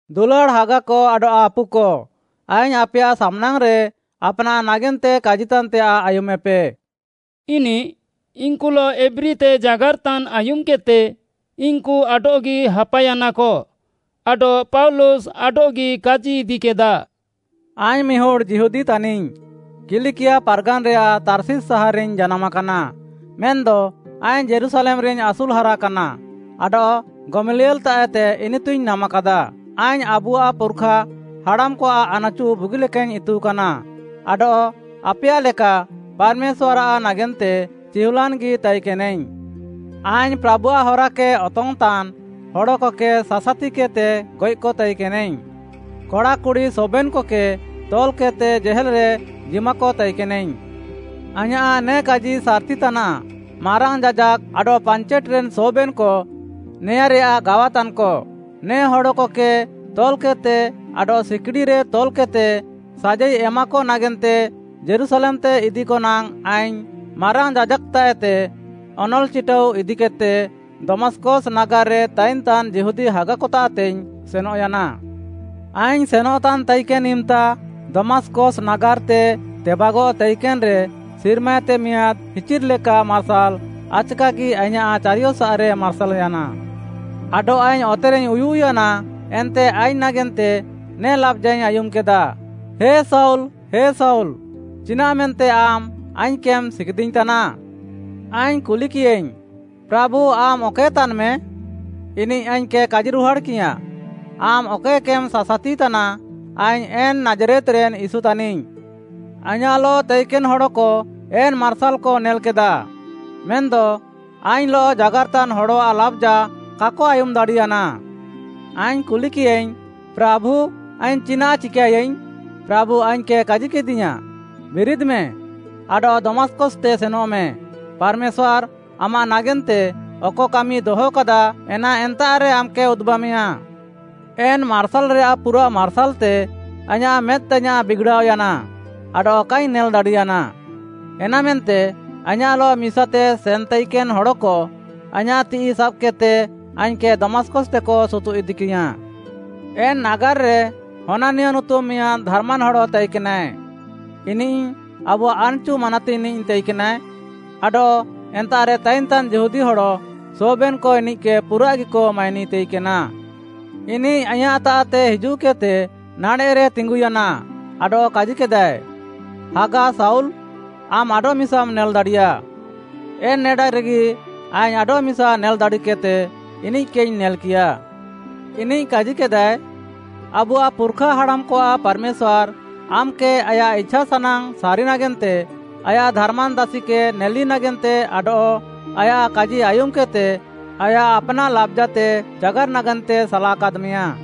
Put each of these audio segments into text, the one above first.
“ଦୁଲାଡ଼୍‌ ହାଗାକ ଆଡଃ ଆପୁକ, ଆଇଙ୍ଗ୍‌ ଆପେୟାଃ ସାମ୍‌ନାଙ୍ଗ୍‌ରେ ଆପ୍‌ନାଃ ନାଗେନ୍ତେ କାଜିତାନ୍‌ତେୟାଃ ଆୟୁମେପେ,” ଇନିଃ ଇନ୍‌କୁଲଃ ଏବ୍ରୀତେ ଜାଗାର୍‌ତାନ୍‌ ଆୟୁମ୍‌କେଦ୍‌ତେ ଇନ୍‌କୁ ଆଡଃଗି ହାପାୟାନାକ ଆଡଃ ପାଉଲୁସ୍‌ ଆଡଃଗି କାଜିଇଦିକେଦା, “ଆଇଙ୍ଗ୍‌ ମିହୁଡ଼୍‌ ଯିହୁଦୀ ତାନିଙ୍ଗ୍‌, କିଲିକିଆ ପାର୍‌ଗାନ୍‌ରେୟାଃ ତାର୍ଷିସ୍‌ ସାହାର୍‌ରେଇଙ୍ଗ୍‌ ଜାନାମ୍‌ କାନା, ମେନ୍‌ଦ ଆଇଙ୍ଗ୍‌ ଯୀରୁଶାଲେମ୍‌ରେଇଙ୍ଗ୍‌ ଆସୁଲ୍‌ ହାରାକାନା ଆଡଃ ଗମଲିଏଲ୍‌ତାଃଏତେ ଇନିତୁଇଙ୍ଗ୍‌ ନାମାକାଦା। ଆଇଙ୍ଗ୍‌ ଆବୁଆଃ ପୁର୍‌ଖା ହାଡ଼ାମ୍‌କଆଃ ଆନ୍‌ଚୁ ବୁଗିଲେକାଇଙ୍ଗ୍‌ ଇତୁକାନା ଆଡଃ ଆପେୟାଃ ଲେକା ପାର୍‌ମେଶ୍ୱାର୍‌ଆଃ ନାଗେନ୍ତେ ଚିହୁଲାନ୍‌ଗି ତାଇକେନାଇଙ୍ଗ୍‌। ଆଇଙ୍ଗ୍‌ ପ୍ରାଭୁଆଃ ହରାକେ ଅତଙ୍ଗ୍‌ତାନ୍‌ ହଡ଼କକେ ସାସାତିକେଦ୍‌ତେ ଗଏଃକ ତାଇକେନାଇଙ୍ଗ୍‌। କଡ଼ା କୁଡ଼ି ସବେନ୍‌କକେ ତଲ୍‌କେଦ୍‌ତେ ଜେହେଲ୍‌ରେ ଜିମାକ ତାଇକେନାଇଙ୍ଗ୍‌। ଆଇଁୟାଃ ନେ କାଜି ସାର୍‌ତି ତାନାଃ, ମାରାଙ୍ଗ୍‌ ଯାଜାକ୍‌ ଆଡଃ ପାଞ୍ଚେଟ୍‌ରେନ୍‌ ସବେନ୍‌କ ନେଆଁରେୟାଃ ଗାୱାତାନ୍‌କ। ନେ ହଡ଼କକେ ତଲ୍‌କେଦ୍‌ତେ ଆଡଃ ସିକିଡ଼ିରେ ତଲ୍‌କେଦ୍‌ତେ ସାଜାଇ ଏମାକ ନାଗେନ୍ତେ ଯୀରୁଶାଲେମ୍‌ତେ ଇଦିକ ନାଙ୍ଗ୍‌ ଆଇଙ୍ଗ୍‌ ମାରାଙ୍ଗ୍‌ ଯାଜାକ୍‌ତାଃଏତେ ଅନଲ୍‌ ଚିଟାଉ ଇଦିକେଦ୍‌ତେ, ଦମାସ୍‌କସ୍‌ ନାଗାର୍‌ରେ ତାଇନ୍‌ତାନ୍‌ ଯିହୁଦୀ ହାଗାକତାଃତେଇଙ୍ଗ୍‌ ସେନଃୟାନା। “ଆଇଙ୍ଗ୍‌ ସେନଃତାନ୍‌ ତାଇକେନ୍‌ ଇମ୍‌ତା ଦମାସ୍‌କସ୍‌ ନାଗାର୍‌ତେ ତେବାଗଃ ତାଇକେନ୍‌ରେ ସିର୍ମାଏତେ ମିଆଁଦ୍‌ ହିଚିର୍‌ଲେକା ମାର୍ସାଲ୍‌ ଆଚ୍‌କାଗି ଆଇଁୟାଃ ଚାରିୟସାଃରେ ମାର୍ସାଲ୍‌ୟାନା। ଆଡଃ ଆଇଙ୍ଗ୍‌ ଅତେରେଇଙ୍ଗ୍‌ ଉୟୁଃୟାନା ଏନ୍ତେ ଆଇଙ୍ଗ୍‌ ନାଗେନ୍ତେ ନେ ଲାବ୍‌ଜାଇଙ୍ଗ୍‌ ଆୟୁମ୍‌କେଦା, ‘ହେ ଶାଉଲ୍, ହେ ଶାଉଲ୍‌, ଚିନାଃମେନ୍ତେ ଆମ୍‌ ଆଇଙ୍ଗ୍‌କେମ୍‌ ସିଗିଦିଇଙ୍ଗ୍‌ତାନା?’ ଆଇଙ୍ଗ୍‌ କୁଲିକିୟାଇଙ୍ଗ୍‌, ‘ପ୍ରାଭୁ, ଆମ୍‌ ଅକଏ ତାନ୍‌ମେ?’ ଇନିଃ ଆଇଙ୍ଗ୍‌କେ କାଜିରୁହାଡ଼୍‌କିୟାଁ, ‘ଆମ୍‌ ଅକଏକେମ୍‌ ସାସାତିତାନା, ଆଇଙ୍ଗ୍‌ ଏନ୍‌ ନାଜ୍‌ରେତ୍‌ରେନ୍‌ ୟୀଶୁ ତାନିଙ୍ଗ୍‌।’ ଆଇଁୟାଃଲଃ ତାଇକେନ୍‌ ହଡ଼କ ଏନ୍‌ ମାର୍ସାଲ୍‌କ ନେଲ୍‌କେଦା, ମେନ୍‌ଦ ଆଇଙ୍ଗ୍‌ଲଃ ଜାଗାର୍‌ତାନ୍‌ ହଡ଼ଆଃ ଲାବ୍‌ଜା କାକ ଆୟୁମ୍‌ ଦାଡ଼ିୟାନା। ଆଇଙ୍ଗ୍‌ କୁଲିକିୟାଇଙ୍ଗ୍‌, ‘ପ୍ରାଭୁ, ଆଇଙ୍ଗ୍‌ ଚିନାଃ ଚିକାଏୟାଇଙ୍ଗ୍‌?’ ପ୍ରାଭୁ ଆଇଙ୍ଗ୍‌କେ କାଜିକେଦିୟାଁ, ‘ବିରିଦ୍‌ମେ, ଆଡଃ ଦମାସ୍‌କସ୍‌ତେ ସେନଃମେ, ପାର୍‌ମେଶ୍ୱାର୍‌ ଆମାଃ ନାଗେନ୍ତେ ଅକ କାମି ଦହକାଦା, ଏନା ଏନ୍ତାଃରେ ଆମ୍‌କେ ଉଦୁବାମେୟାଁ।’ ଏନ୍‌ ମାର୍ସାଲ୍‌ରେୟାଃ ପୁରାଃ ମାର୍ସାଲ୍‌ତେ ଆଇଁୟାଃ ମେଦ୍‌ତାଇୟାଁଃ ବିଗ୍‌ଡ଼ାଅୟାନା ଆଡଃ କାଇଙ୍ଗ୍‌ ନେଲ୍‌ଦାଡ଼ିୟାନା। ଏନାମେନ୍ତେ ଆଇଁୟାଃଲଃ ମିସାତେ ସେନ୍‌ତାଇକେନ୍‌ ହଡ଼କ ଆଇଁୟାଃ ତିଃଇ ସାବ୍‌କେଦ୍‌ତେ ଆଇଙ୍ଗ୍‌କେ ଦମାସ୍‌କସ୍‌ତେକ ସୁତୁଃଇଦିକିୟାଁ। “ଏନ୍‌ ନାଗାର୍‌ରେ ହନାନିୟ ନୁତୁମ୍‌ ମିଆଁଦ୍‌ ଧାର୍‌ମାନ୍‌ ହଡ଼ ତାଇକେନାଏ। ଇନିଃ ଆବୁଆଃ ଆନ୍‌ଚୁ ମାନାତିଙ୍ଗ୍‌ନିଃ ତାଇକେନାଏ ଆଡଃ ଏନ୍ତାଃରେ ତାଇନ୍‌ତାନ୍‌ ଯିହୁଦୀ ହଡ଼ ସବେନ୍‌କ ଇନିଃକେ ପୁରାଃଗିକ ମାଇନି ତାଇକେନା। ଇନିଃ ଆଇଁୟାଃତାଃତେ ହିଜୁଃକେଦ୍‌ତେ ନାଡ଼େଃରେ ତିଙ୍ଗୁୟାନା ଆଡଃ କାଜିକେଦାଏ, ‘ହାଗା ଶାଉଲ୍‌, ଆମ୍‌ ଆଡଃମିସାମ୍‌ ନେଲ୍‌ଦାଡ଼ିୟା।’ ଏନ୍‌ ନେଡାରେଗି ଆଇଙ୍ଗ୍‌ ଆଡଃମିସା ନେଲ୍‌ ଦାଡ଼ିକେଦ୍‌ତେ, ଇନିଃକେଇଙ୍ଗ୍‌ ନେଲ୍‌କିୟା। ଇନିଃ କାଜିକେଦାଏ, ‘ଆବୁଆଃ ପୁର୍‌ଖା ହାଡ଼ାମ୍‌କଆଃ ପାର୍‌ମେଶ୍ୱାର୍‌ ଆମ୍‌କେ ଆୟାଃ ଇଛାସାନାଙ୍ଗ୍‌ ସାରି ନାଗେନ୍ତେ, ଆୟାଃ ଧାର୍‌ମାନ୍‌ ଦାସିକେ ନେଲି ନାଗେନ୍ତେ ଆଡଃ ଆୟାଃ କାଜି ଆୟୁମ୍‌କେଦ୍‌ତେ ଆୟାଃ ଆପ୍‌ନାଃ ଲାବ୍‌ଜାତେ ଜାଗାର୍‌ ନାଗେନ୍ତେ ସାଲାକାଦ୍‌ମେୟା।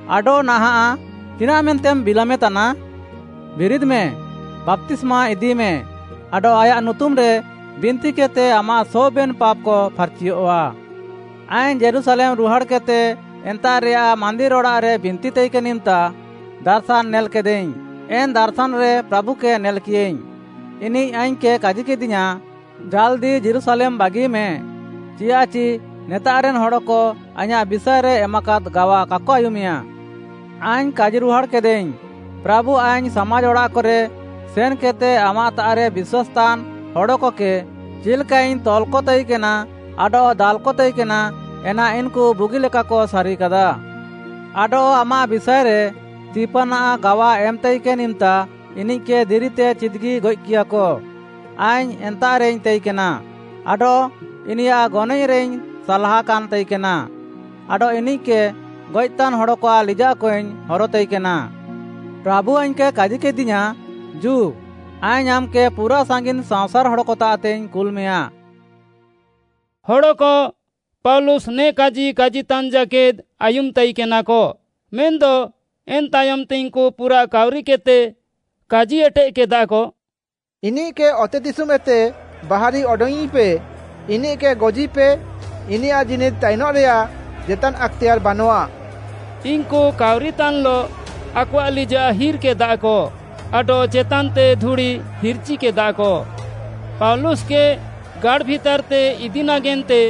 ଆଡଃ ନାହାଁଃ, ଚିନାଃମେନ୍ତେମ୍‌ ବିଲାମେତାନା? ବିରିଦ୍‌ମେ, ବାପ୍ତିସ୍ମା ଇଦିମେ ଆଡଃ ଆୟାଃ ନୁତୁମ୍‌ରେ ବିନ୍ତିକେଦ୍‌ତେ ଆମାଃ ସବେନ୍‌ ପାପ୍‌କ ଫାର୍‌ଚିୟଃଆ।’ “ଆଇଙ୍ଗ୍‌ ଯୀରୁଶାଲେମ୍‌ ରୁହାଡ଼୍‌କେଦ୍‌ତେ ଏନ୍ତାଃରେୟାଃ ମାନ୍ଦିର୍‌ ଅଡ଼ାଃରେ ବିନ୍ତିତାଇକେନ୍‌ ଇମ୍‌ତା, ଦାର୍‌ଶାନ୍‌ ନେଲ୍‌କେଦାଇଙ୍ଗ୍‌, ଏନ୍‌ ଦାର୍‌ଶାନ୍‌ରେ ପ୍ରାଭୁକେ ନେଲ୍‌କିୟାଇଙ୍ଗ୍‌। ଇନିଃ ଆଇଙ୍ଗ୍‌କେ କାଜିକେଦିୟାଁ, ‘ଜାଲ୍‌ଦି ଯୀରୁଶାଲେମ୍‌ ବାଗିମେ, ଚିଆଃଚି ନେତାଃରେନ୍‌ ହଡ଼କ ଆଇଁୟାଃ ବିଷାଏରେ ଏମାକାଦ୍‌ ଗାୱା କାକ ଆୟୁମେୟା।’ ଆଇଙ୍ଗ୍‌ କାଜିରୁହାଡ଼୍‌କେଦାଇଙ୍ଗ୍‌, ‘ପ୍ରାଭୁ ଆଇଙ୍ଗ୍‌ ସାମାଜ୍‌ ଅଡ଼ାଃକରେ ସେନ୍‌କେଦ୍‌ତେ ଆମାଃତାଃରେ ବିଶ୍ୱାସ୍‌ତାନ୍‌ ହଡ଼କକେ ଚିଲ୍‌କାଇଙ୍ଗ୍‌ ତଲ୍‌କତାଇକେନା ଆଡଃ ଦାଲ୍‌କ ତାଇକେନା, ଏନା ଇନ୍‌କୁ ବୁଗିଲେକାକ ସାରିକାଦା, ଆଡଃ ଆମାଃ ବିଷାଏରେ ସ୍ତିଫାନ୍‌ ଗାୱା ଏମ୍‌ତାଇକେନ୍‌ ଇମ୍‌ତା ଇନିଃକେ ଦିରିତେ ଚିଦ୍‌ଗି ଗଏଃକିୟାକ, ଆଇଙ୍ଗ୍‌ ଏନ୍ତାଃରେଇଙ୍ଗ୍‌ ତାଇକେନା, ଆଡଃ ଇନିୟାଃ ଗନଏଃରେଇଙ୍ଗ୍‌ ସାଲ୍‌ହାକାନ୍‌ ତାଇକେନା ଆଡଃ ଇନିଃକେ ଗଏଃତାନ୍‌ ହଡ଼କଆଃ ଲିଜାଃକଇଙ୍ଗ୍‌ ହରତାଇକେନା।’ ପ୍ରାଭୁ ଆଇଙ୍ଗ୍‌କେ କାଜିକେଦିୟାଁ, ‘ଜୁ, ଆଇଙ୍ଗ୍‌ ଆମ୍‌କେ ପୁରାଃ ସାଙ୍ଗିନ୍‌ ସାଅଁସାର୍‌ ହଡ଼କତାଃତେଇଙ୍ଗ୍‌ କୁଲ୍‌ମେୟାଁ।’” ହଡ଼କ ପାଉଲୁସ୍‌ ନେ କାଜି କାଜିତାନ୍‌ ଜାକେଦ୍‌ ଆୟୁମ୍‌ ତାଇକେନାକ, ମେନ୍‌ଦ ଏନ୍‌ ତାୟମ୍‌ତେ ଇନ୍‌କୁ ପୁରାଃ କାଉରିକେଦ୍‌ତେ କାଜି ଏଟେଃକେଦାକ, “ଇନିଃକେ ଅତେଦିଶୁମ୍‌ଏତେ ବାହାରି ଅଡଙ୍ଗ୍‌ଇଁପେ, ଇନିଃକେ ଗଜିପେ, ଇନିୟାଃ ଜୀନିଦ୍‌ ତାଇନଃରେୟାଃ ଜେତାନ୍‌ ଆକ୍‌ତେୟାର୍‌ ବାନଃଆ।” ଇନ୍‌କୁ କାଉରିତାନ୍‍ଲଃ ଆକଆଃ ଲିଜାଃ ହିର୍‌କେଦାକ ଆଡଃ ଚେତାନ୍‌ତେ ଧୁଡ଼ି ହିର୍‌ଚିକେଦାକ। ପାଉଲୁସ୍‌କେ ଗାଡ଼୍‌ ଭିତାର୍‌ତେ ଇଦି ନାଗେନ୍ତେ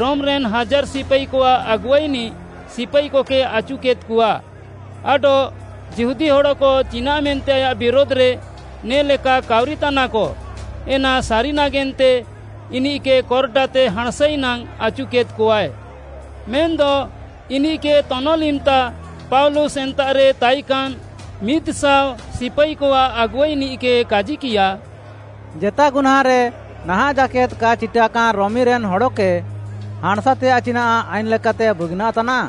ରୋମ୍‌ରେନ୍‌ ହାଜାର୍‌ ସିପାଇକଆଃ ଆଗୁଆଇନିଃ ସିପାଇକକେ ଆଚୁକେଦ୍‌କଆ ଆଡଃ ଯିହୁଦୀ ହଡ଼କ ଚିନାଃମେନ୍ତେ ଆୟାଃ ବିରୁଧ୍‌ରେ ନେ'ଲେକା କାଉରିତାନାକ, ଏନା ସାରି ନାଗେନ୍ତେ ଇନିଃକେ କର୍‌ଡାତେ ହାଁଣ୍‌ସାଇ ନାଙ୍ଗ୍‌ ଆଚୁକେଦ୍‌କଆଏ। ମେନ୍‌ଦ ଇନିଃକେ ତନଲ୍‌ ଇମ୍‌ତା ପାଉଲୁସ୍‌ ଏନ୍ତାଃରେ ତାଇକାନ୍‌ ମିଦ୍‌ଶାଅ ସିପାଇକଆଃ ଆଗୁଆଇନିଃକେ କାଜିକିୟା, “ଜେତା ଗୁହ୍ନାଁଁରେ ନାହାଁଃ ଜାକେଦ୍‌ କା ଚିଟାକାନ୍‌ ରୋମିରେନ୍‌ ହଡ଼କେ ହାଁଣ୍‌ସାତେୟାଃ ଚିନାଃ ଆଇନ୍‌ ଲେକାତେ ବୁଗିନାଃ ତାନାଃ?”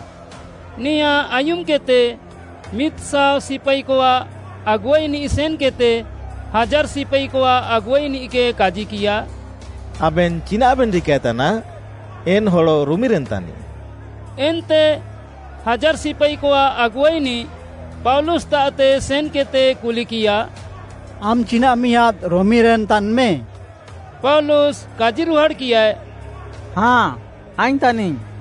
ନେଆଁ ଆୟୁମ୍‌କେଦ୍‌ତେ ମିଦ୍‌ଶାଅ ସିପାଇକଆଃ ଆଗୁଆଇନିଃ ସେନ୍‌କେଦ୍‌ତେ ହାଜାର୍‌ ସିପାଇକଆଃ ଆଗୁଆଇନିଃକେ କାଜିକିୟା, “ଆବେନ୍‌ ଚିନାଃବେନ୍‌ ଚିକାଏତାନା? ଏନ୍‌ ହଡ଼ ରୋମିରେନ୍‌ ତାନିଃ।” ଏନ୍ତେ ହାଜାର୍‌ ସିପାଇକଆଃ ଆଗୁଆଇନିଃ ପାଉଲୁସ୍‌ତାଃତେ ସେନ୍‌କେଦ୍‌ତେ କୁଲିକିୟା, “ଆମ୍‌ ଚିନାଃ ମିଆଁଦ୍‌ ରୋମିରେନ୍‌ ତାନ୍‌ମେ?” ପାଉଲୁସ୍‌ କାଜିରୁହାଡ଼୍‌କିୟାଏ, “ହାଁ, ଆଇଙ୍ଗ୍‌ ତାନିଙ୍ଗ୍‌।”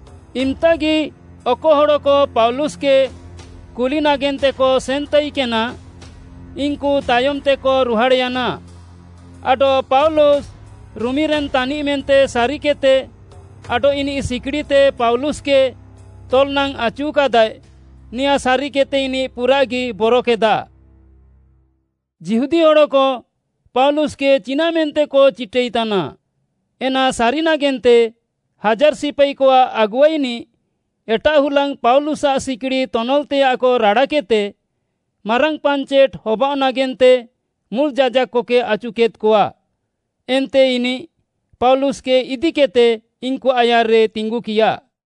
ଇମ୍‌ତାଗି ଅକ ହଡ଼କ ପାଉଲୁସ୍‌କେ କୁଲି ନାଗେନ୍ତେକ ସେନ୍‌ତାଇକେନା, ଇନ୍‌କୁ ତାୟମ୍‌ତେକ ରୁହାଡ଼୍‌ୟାନା ଆଡଃ ପାଉଲୁସ୍‌ ରୋମିରେନ୍‌ ତାନିଃ ମେନ୍ତେ ସାରିକେଦ୍‌ତେ ଆଡଃ ଇନିଃ ସିକିଡ଼ିତେ ପାଉଲୁସ୍‌କେ ତଲ୍‌ ନାଙ୍ଗ୍‌ ଆଚୁକାଦାଏ, ନେଆଁ ସାରିକେଦ୍‌ତେ, ଇନିଃ ପୁରାଃଗି ବରକେଦା। ଯିହୁଦୀ ହଡ଼କ ପାଉଲୁସ୍‌କେ ଚିନାଃମେନ୍ତେକ ଚିଟାଇତାନା, ଏନା ସାରି ନାଗେନ୍ତେ ହାଜାର୍‌ ସିପାଇକଆଃ ଆଗୁଆଇନିଃ ଏଟାଃ ହୁଲାଙ୍ଗ୍‌ ପାଉଲୁସ୍‌ଆଃ ସିକିଡ଼ି ତନଲ୍‌ତେୟାଃକ ରାଡ଼ାକେଦ୍‌ତେ ମାରାଙ୍ଗ୍‌ ପାଞ୍ଚେଟ୍‌ ହବାଅଃ ନାଗେନ୍ତେ ମୁଲ୍‌ ଯାଜାକ୍‌କକେ ଆଚୁକେଦ୍‌କଆ। ଏନ୍ତେ ଇନିଃ ପାଉଲୁସ୍‌କେ ଇଦିକେଦ୍‌ତେ ଇନ୍‌କୁଆଃ ଆୟାର୍‌ରେ ତିଙ୍ଗୁକିୟା।